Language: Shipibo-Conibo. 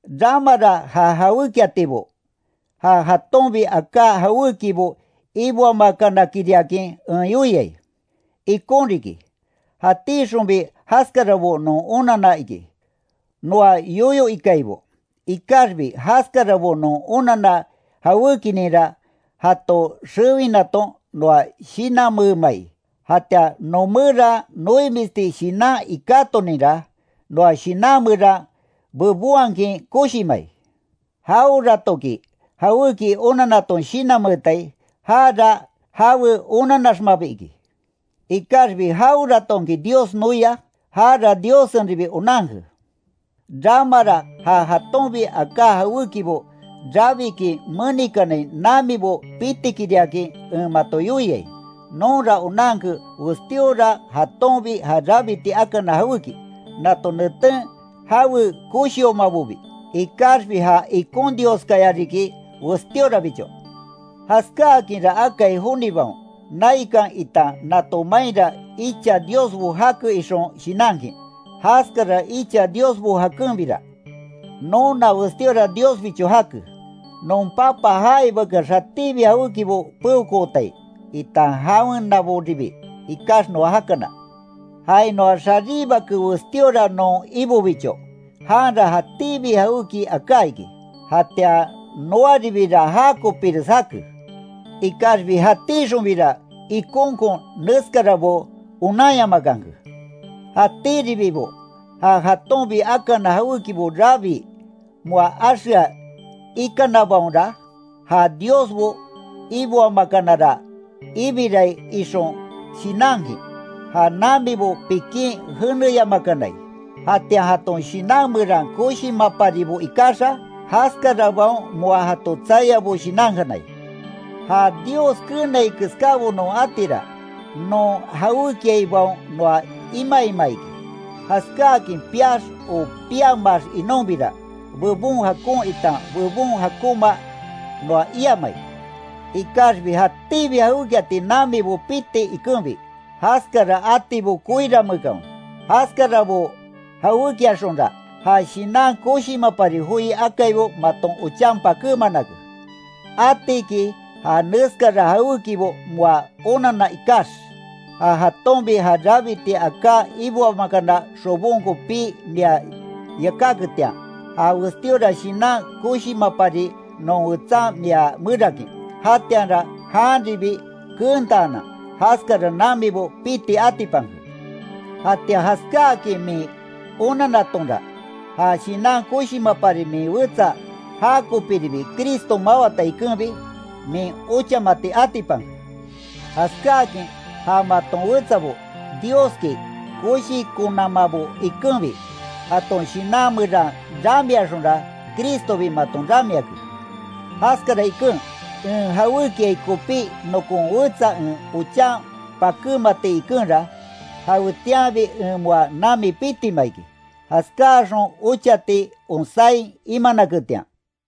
Ramara ja jawékiatibo, ja jatonbi aká jawékibo iboamakanakiriakin en yoiai, ikon riki, jatíxonbi jaskarabo non onanna iki, noa yoyo ikaibo. Ikaxbi, jaskarabo non onanna jawékininra jato xewinaton noa shinanmeemai, jatian noomeran noimisti shinan ikátoninra, noa shinan meran bebonhakin koshimai. Jaweratoki, jawéki onannaton shinanmeetai, jara jawe onanaxmabi iki. Ikaxbi jaweratonki Dios noia, jara Diossenribi onanke. Ramara ja jatonbi aká jawékibo rabikin menikanai namibo pitikiriakin en mato yoiai. Nonra onanke westíora jatonbi ja rabiti akana jawéki, nato neten jawe koshiomabobi, ikaxbi ja ikon Dioskaya riki westíorabicho, Jaskáakinra akai jonibaon, naikan itan nato mainra icha diosbo jake, ixon shinankin, jaskara icha diosbo jakenbira. Nona westíora Diosbicho jake, non Papa jaibakeax jatíbi jawékibo peokootai, itan jawenaboribi ikax noa jakana. Jainoax jaríbake westíora non Ibobicho, janra jatíbi jawéki aká iki. Jatian noaribira jakopires jake. Ikaxbi jatíxonbira, ikonkon neskarabo onanyamakanke, jatíribibo ja jatonbi akana jawékibo rabii, moa axea ikanabaonra, ja diosbo iboamakanara ibirai ixon shinankin, ja namibo pikin jeneyamakanai, jatian jaton shinan meran koshimaparibo ikaxa, jaskarabaon moa jato tsaiabo shinankanai. Ja Dios keenai keskábo non atira, non jawékiaibaon noa imaima iki. Jaskákin piax o piamaax inonbira, bebon jakon itan bebon jakonma noa iamai, ikaxbi jatíbi jawékiati namibo piti ikenbi, jaskara atibo koiranmeekanwe, jaskarabo jawékiaxonra, ja shinan koshimapari joi akaibo maton ochan pakémanake. Atiki ja neskara jawékibo moa onanna ikax, ja jatonbi ja rabiti aká iboamakana xobonko pii mia yakáketian, ja westíora shinan koshimapari non wetsan mia merakin, jatianra janribi keentaanan, jaskara namibo piti atipanke. Jatian jaskáakin min onanatonra, ja shinan koshimapari min wetsa já kopiribi Cristo mawata ikenbi, min ochamati atipanke, jaskáakin ja maton wetsabo, Dioski koshikonamabo ikenbi, jaton shinan meran ramiaxonra, Cristobi maton ramiake. Jaskara iken, en jawékiai kopí nokon wetsa en ochan pakémati ikenra, jawetianbi en moa nami pitima iki, jaskáaxon ochati onsáin imanaketian.